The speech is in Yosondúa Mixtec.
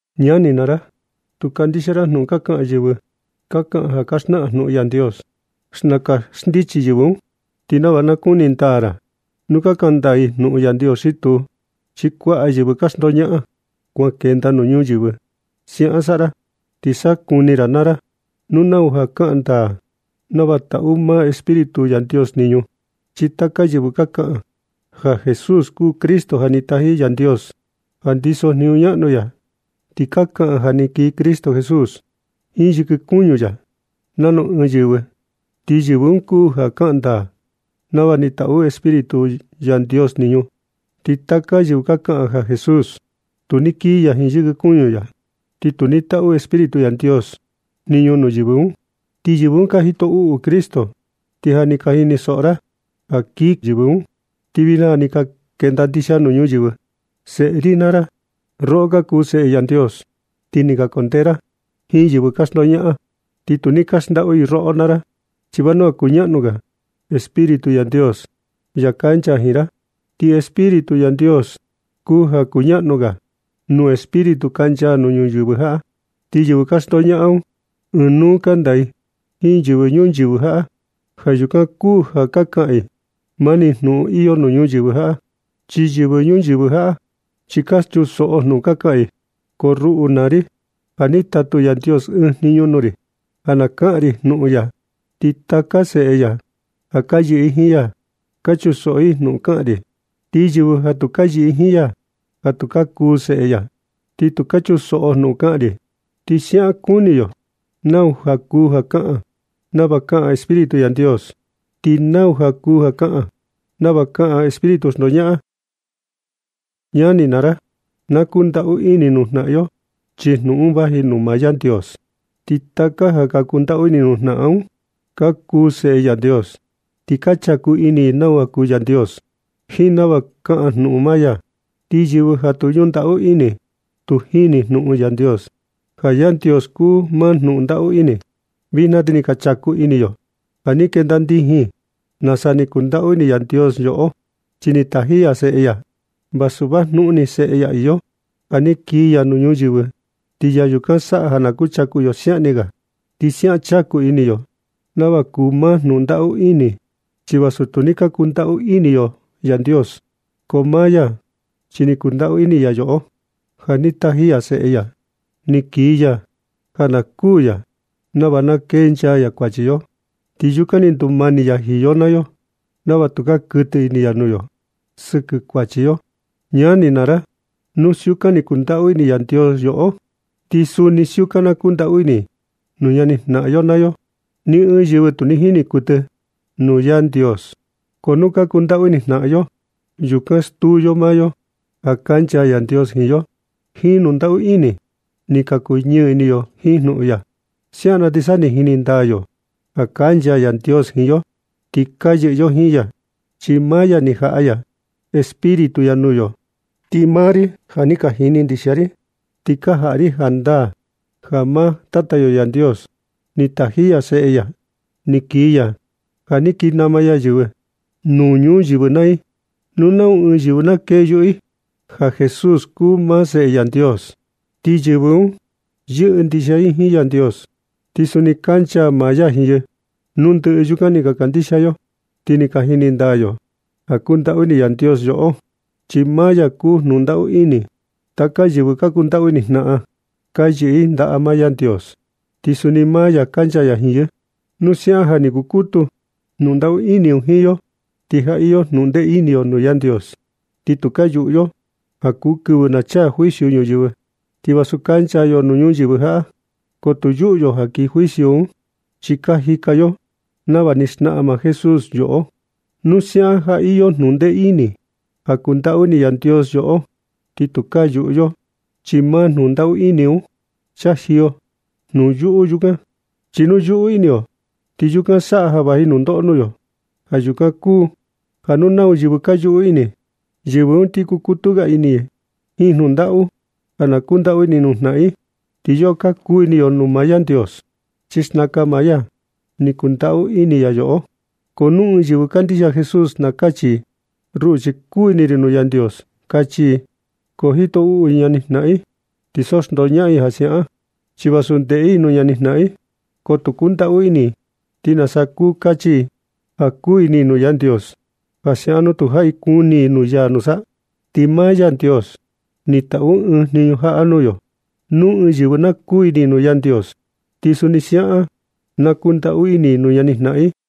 Ñani naa ra, tu kandixia ra jnuꞌun ka xnaꞌan yɨvɨ ka kaꞌan ja ka xnaꞌan jnuꞌun Yandios. Xnaka xndichi yɨvɨ un, ti nava na kuni ndaa ra nu ka kaꞌan ndaa i jnuꞌun Yandios xi tuu, chi kuaꞌa yɨvɨ ka xndoñaꞌan kuan kenda nuu ñuyɨvɨ. Siaꞌan saꞌa ra ti sa kuni ra naa ra nu nau ja kaꞌan ndaa nava taꞌu maa Espíritu Yandios jniñu. Chi taka yɨvɨ kaꞌan ja Jesús kuu Cristo ni taji Yandios, ja ndiso jniñu ñaꞌnu ya, ti ka kaꞌan ja ni kii Cristo Jesús jiin yɨkɨ kuñu ya nanu ɨɨn yɨvɨ, ti yɨvɨ un kuu ja kaꞌan ndaa nava ni taꞌu Espíritu Yandios jniñu. Ti taka yɨvɨ ja kaꞌan ja Jesús tu ni kii ya jiin yɨkɨ kuñu ya, ti tu ni taꞌu Espíritu Yandios jniñu nuu yɨvɨ un. Ti yɨvɨ un kuu ja jito uꞌu Cristo. Ti ja ni ka jinisoꞌo ra ja kii yɨvɨ un, ti vijna ja ni ka kenda ndixia nuu ñuyɨvɨ. Seꞌe ri naa ra, roꞌo ka kuu seꞌe Yandios ti ni ka kundee ra jiin yɨvɨ ka xndoñaꞌan un. Ti tu ni ka xndaꞌu i roꞌo naa ra, chi vanua kuñaꞌnu ga Espíritu Yandios, ya kancha jiin ra, ti Espíritu Yandios kuu ja kuñaꞌnu ga nuu espíritu kancha nuu ñuyɨvɨ jaꞌa. Ti yɨvɨ ka xndoñaꞌan un, ɨɨn nuu kanda i jiin yɨvɨ ñuyɨvɨ jaꞌa. Ja yukan kuu ja ka kaꞌan i mani jnuꞌun iyo nuu ñuyɨvɨ jaꞌa, ti yɨvɨ ñuyɨvɨ jaꞌa chi ka chunsoꞌo jnuꞌun ka kaꞌan i. Ko ruꞌu naa ri, ja ni tatu Yandios ɨɨn jniñu nuu ri ja na kaꞌan ri jnuꞌun ya. Ti taka seꞌe ya ja ka yɨꞌɨ jiin ya, ka chunsoꞌo i jnuꞌun ka kaꞌan ri. Ti yɨvɨ ja tu ka yɨꞌɨ jiin ya, tu ka kuu seꞌe ya, ni tu ka chunsoꞌo jnuꞌun ka kaꞌan ri. Ti siaꞌan nakuni yo nau kuu ja ka kaꞌan nava kaꞌan Espíritu Yandios, ti nau kuu ja ka kaꞌan nava kaꞌan espíritu xndoñaꞌan. Ñani naa ra, na kundaꞌu ini nuu jnaꞌan yo, chi jnuꞌun un vaji nuu maa Yandios. Ti taka ja ka kundaꞌu ini nuu jnaꞌan un, ka kuu seꞌe Yandios. Ti ka chaku ini nau kuu Yandios, jiin nava kaꞌan maa jnuꞌun ya. Ti yɨvɨ ja tu ñundaꞌu ini tu jini jnuꞌun Yandios, ja Yandios kuu maa jnuꞌun ndaꞌu ini. Vijna ti ni ka chaku ini yo ja ni kenda ndijin nasa ni kundaꞌu ini Yandios yoꞌo, chi ja ni taji ya Seꞌe ya vasu vajnuꞌun ni seꞌe ya iyo, ja ni kii ya un nuu ñuyɨvɨ, ti ya yukan saꞌa ja na kuchaku yo siaꞌan ni ga. Ti siaꞌan chaku ini yo nava kuu maa jnuꞌun ndaꞌu ini. Chi vasu tu ni ka kundaꞌu ini yo Yandios, ko maa ya, chi ni kundaꞌu ini ya yoꞌo ja ni taji ya Seꞌe ya ni kii ya, ja na kuu ya nava na kenchaa ya kuachi yo. Ti yukan ni ndumani ya jiin yo nava tukaa kuɨtɨ ini ya nuu yo sɨkɨ kuachi yo. Ñani naa ra, nu siukan ni kundaꞌu ini Yandios yoꞌo, ti suni siukan na kundaꞌu ini nuu ñani jnaꞌan yo naa yo. Ni ɨɨn yɨvɨ tu ni jini kuɨtɨ i nuu Yandios, ko nu ka kundaꞌu ini jnaꞌan yo, yukan stuu yo maa yo ja kancha Yandios jiin yo. Ti jiin jnuꞌun kundaꞌu ini un ni ka kuñɨɨ ini yo jiin jnuꞌun ya. Siaꞌan na ti sa ni jini ndaa yo ja kancha Yandios jiin yo, ti ka yɨꞌɨ yo jiin ya, chi maa ya ja ni jaꞌa ya Espíritu ya nuu yo. Ti maa ri, ja ni ka jini ndixia ri, ti ka jaꞌa ri jandaa ja maa Tata yo Yandios ni taji ya Seꞌe ya ni kii ya, ja ni kii nama ya yɨvɨ nuu ñuyɨvɨ naa i. Nu nau ɨɨn yɨvɨ na kee yuꞌu i ja Jesús kuu maa Seꞌe Yandios, ti yɨvɨ un yɨꞌɨ ndixia i jiin Yandios, ti suni kancha maa ya jiin i. Nu ndɨꞌɨ yukan ni ka kandixia yo, ti ni ka jini ndaa yo ja kundaꞌu ini Yandios yoꞌo, chi maa ya kuu jnuꞌun ndaꞌu ini. Taka yɨvɨ ka kundaꞌu ini jnaꞌan, ka yɨꞌɨ i ndaꞌa maa Yandios, ti suni maa ya kancha ya jiin yɨ. Nu siaꞌan ja ni kukutu jnundaꞌu ini un jiin yo, ti ja iyo jnuꞌun ndee ini yo nuu Yandios, ti tukaa yuꞌu yo ja kuu kɨvɨ na chaa juicio ñuyɨvɨ. Ti vasu kancha yo nuu ñuyɨvɨ jaꞌa, ko tu yuꞌu yo ja kii juicio un, chi ka jika yo nava ni xnaꞌan maa Jesús yoꞌo. Nu siaꞌan ja iyo jnundee ini ja kundaꞌu ini Yandios yoꞌo, ti tukaa yuꞌu yo, chi maa jnundaꞌu ini un chajiyo jnuyuꞌu un kuaꞌan. Chi nu yuꞌu ini yo, ti yukan saꞌa ja vaji nundoꞌo nuu yo. Ja yukan kuu ja nu nau yɨvɨ ka yuꞌu ini i, yɨvɨ un ti kukutu ga ini i jiin jnundaꞌu, ja na kundaꞌu ini nuu jnaꞌan i. Ti yoꞌo ka kuu ini yo nuu Yandios, chi xnaka maa ya ni kundaꞌu ini ya yoꞌo. Ko nu ɨɨn yɨvɨ kandixia Jesús na kachi i: “Ruꞌu, chi kuu ini ri nuu Yandios”, kachi i. Ko jito uꞌu i ñani jnaꞌan i, ti so xndoñaꞌan i ja siaꞌan. Chi vasu ndeꞌe i nuu ñani jnaꞌan, ko tu kundaꞌu ini i, ¿Ti nasa kuu kachi i ja kuu ini i nuu Yandios ja siaꞌan nu tujaꞌi kuni i nuu ya nusa? Ti maa Yandios ni taꞌu ɨɨn jniñu jaꞌa nuu yo: Nu ɨɨn yɨvɨ na kuu ini nuu Yandios, ti suni siaꞌan na kundaꞌu ini i nuu ñani jnaꞌan i.